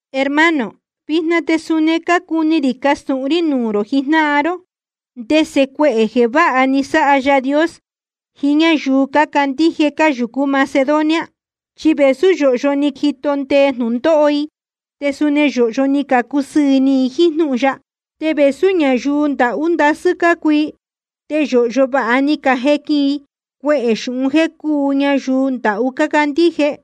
Hermano, vijna te suni cácuni rī castūhun rí nuū rō jijnáhan ró ndese cuehē jeē váha ni sáha Yaā Dios jiín ñáyuu cácandíje cáyūcú Macedonia. Chi vēsú yōhyo ni jito ndee jnūndóho i, te suni yōhyo ni cacusɨɨ̄ ni i jíín jnúhun ya. Te vēsú ñayuu ndahú ndasɨ́ cácuu i, te yōhyo vāha ni cajequin i cuehē xūhun jéē cúu ñayuu ndahú cácandíje.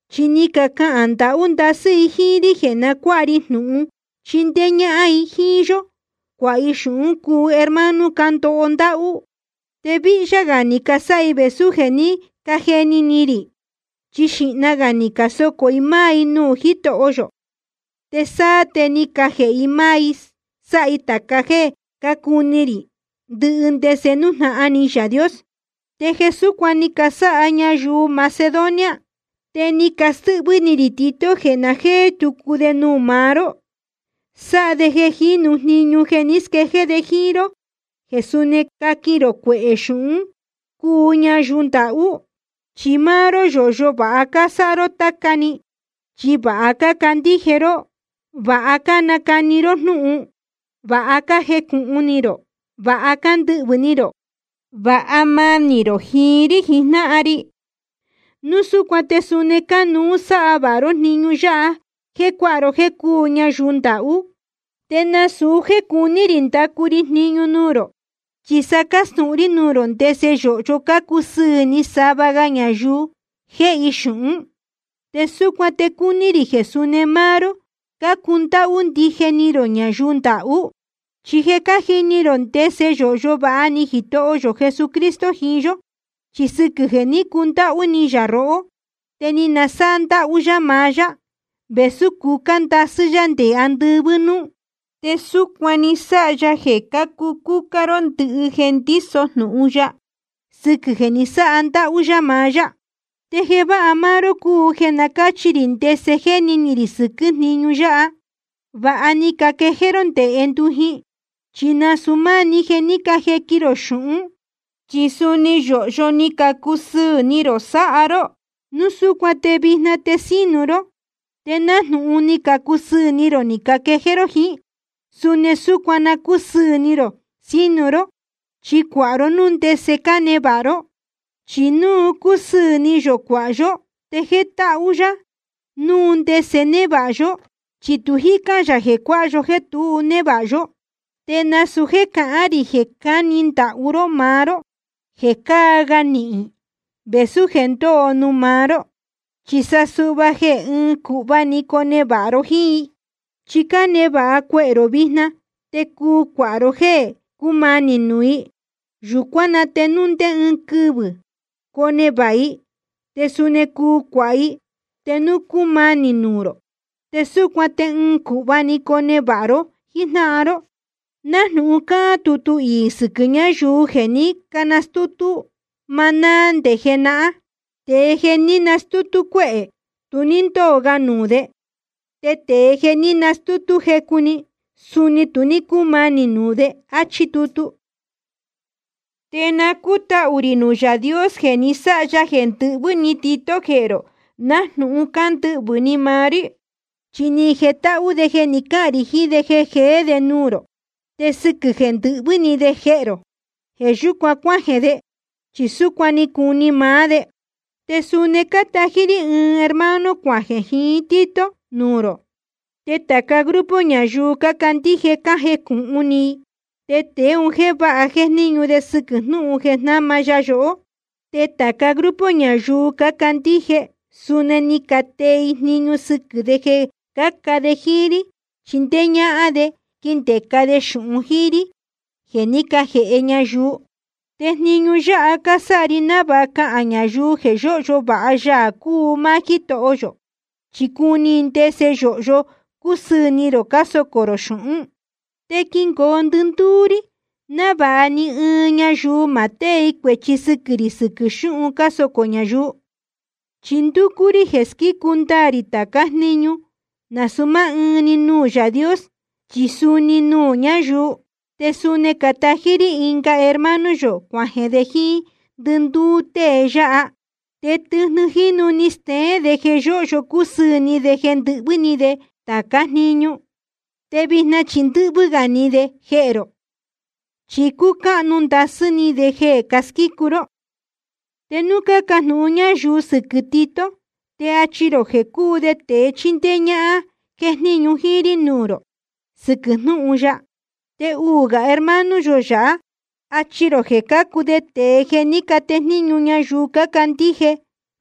Chi ni cacahān ndahú ndasɨ́ i jíín rí jeē na cuáha ri jnūhun chindéé ñáhán i jíín yó cuāha i xūhún cuu hermano cándoho ndáhú. Te víhyá gā ni casáha i vēsú jeē ní cajeni ni rī, chi xīhna gā ni casocō i máá i nuū Jítoho yō, te sáá te ni cajēhe i máá i sáha i tāca jéē cácuni rī, ndɨhɨ ndese nújnahan ni Yaā Dios. Te jeē súcuan ni casáha ñayuu Macedonia, te ni castɨ́hvɨ́ ni rī Tito jeē na jéé tucu de nuū maá ró, sáha de jeē jīnu jniñu jeē ni squéjéé de jíín ró jeē suni caquin rō cuehē xūhún cuu ñayuu ndahú. Chi máá ró yōhyo vāha cásáha ró táca‑ni, chi vāha cácandíje ró, vāha cánacani ró jnúhun, vāha cájecūhun ni rō, vāha cándɨhvɨ̄ ni rō, vāha manī rō jiín rí jijnáhan ri. Núu súcuan te suni cánuú sáha vāha ró jniñu yáha jéē cuáha ró jéē cúu ñayuu ndahú. Te nasūu jéē cuní rī ndacu ri jniñu nuū rō, chi sa cástūhun rí nuū rō ndese yōhyo cácusɨɨ̄ ni sava ga ñayuu jéhe i xūhún, te súcuan te cuni rī jeē suni máá ró cácundáhú ndije ni rō ñayuu ndahú. Chi je cájini rō ndese yōhyo vāha ni Jitoho yō Jesucristo jiín yó. Chi sɨquɨ̄ jeē ní cundáhú ni yā rohó te ni nasáha ndáhú yá maá yá, vēsú cucá ndasɨ́ yá nde andɨvɨ́ núú. Te súcuan ni sáha ya jeē cácucúcá ró ndɨhɨ jeē ndíso jnūhun ya, sɨquɨ̄ jeē ní nasáha ndáhú yá maá yá. Te jeē váha máá ró cúu jeē na cáchi rī ndese jéni ni rī sɨquɨ̄ jníñu yáha. Vāha ni caquejéé ró nde jendujin, chi nasūu máá‑ni jeē ní cajequin rō xūhún, chi suni yōhyo ni cacusɨɨ̄ ni rō sáha ró. Núu súcuan te vijna te sínu ró. Te nájnūhun ni cacusɨɨ̄ ni rō ni caquejéé ró jiín, suni súcuan na cúsɨɨ̄ ni rō sínu ró, chi cuāha ró núu ndese cánevāha ró. Chi núu cúsɨɨ̄ ni yō cuāha yó, te jétáhú yá núu ndese névāha yó, chi tu jícán yā jeē cuāha yó jéē tu névāha yó. Te nasūu jéē cahán rī jeē cáhni ndahú ró máá ró jeē cáa ga nihīn i vēsú jeē ndóo nuū maá ró. Chi sa suhva jeē ɨɨn cūhva‑ni conevāha ró jíín i. Chi cánevāha cuehē rō vijna, te cuu cuāha ró jéē cúmanī nuū i. Yūcuán na te núu ndé ɨɨn quɨvɨ̄ conevāha i, te suni cuu cuāha i te núu ni cumanī nuū rō. Te súcuan te ɨɨn cūhva‑ni conevāha ró jíjnáhan ró, nájnūhun cáhán tutu iī sɨquɨ̄ ñáyuu jeē ní canastútú maná nde jenahán: Tēe jeē ní nastútú cuéhē, tu ní ndóo ga nuū de. Te tēe jeē ní nastútú jecu‑ni, suni tu ní cúmanī nuū de. Achí tutu. Te na cútahū rī nuū Yaā Dios jeē ni sáha ya jeē ndɨhvɨ́ ni Tito jehē rō nájnūhun cándɨhvɨ̄ ni maá rí. Chi ni jetáhú de jeē ní cacahān rī jiín de jeē jeé de nuū rō. Te sɨquɨ̄ jeē ndɨhvɨ́ ni de jehē rō, jeē yúcuan cuájeē de, chi súcuan cúu ni maá de. Te suni cátají rí ɨɨn hermano cuajeē jiín Tito nuū rō. Te tāca grupo ñayuu cácandíje cájejnúhún i tēe un jéē váha jéjníñu de sɨquɨ̄ jnúhun jeē jnáma ya yohó. Te tāca grupo ñayuu cácandíje suni ni catee i jniñu sɨquɨ̄ de jeē cáca de jíín rí chindéé ñáhán de quindēca de xūhun jíín rí jeē ní cajēhe ñayuu. Te jniñu yáha cásáha ri návāha cahān ñayuu jeē yóhyo vāha Yaā cúu máá Jítoho yō, chi cuni i ndese yōhyo cácusɨɨ̄ ni rō cásocō rō xūhún. Te quingoo ndɨndúú rí návāha ni ɨɨn ñayuu ma tée i cuēchi sɨquɨ̄ rī sɨquɨ̄ xúhun cásocō ñayuu. Chi ndúcú rí jeē squícu ndaā rī tācá jniñu, nasūu máá ɨɨn‑ni nuū Yaā Dios, chi suni nuū ñáyuu. Te suni cátají rí ɨnga hermano yō cuajeē de jíín ndɨndúú tée yáha. Te tɨjnɨ jínu ni steén de jeē yóhyo cúsɨɨ̄ ni de ndɨ́hvɨ́ ni de tācá jniñu. Te vijna chi ndɨ́hvɨ́ gā ni de jehē rō, chi cúcáhnu ndasɨ́ ni de jeē cásquícu ró. Te núu cácajnūhún ñayuu sɨquɨ̄ Tito, te achi rō jeē cúu de tēe chindéé ñáhán jéjníñu jíín rí nuū rō sɨquɨ̄ jnúhun ya. Te uū gā hermano yō yáha, achi rō jeē cácuu de tēe jeē ní catejníñu ñayuu cácandíje,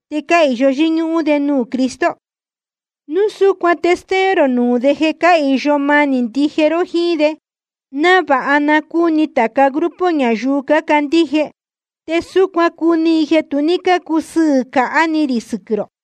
te cáhīyo yɨ́ñúhún de nuū Cristo. Núu súcuan te stéén rō nuū de jeē cáhīyo manī ndije ró jíín de, návāha na cúni tāca grupo ñayuu cácandíje. Te súcuan cuni i jeē tu ní cácusɨɨ̄ cāhá ni rī sɨquɨ̄ rō.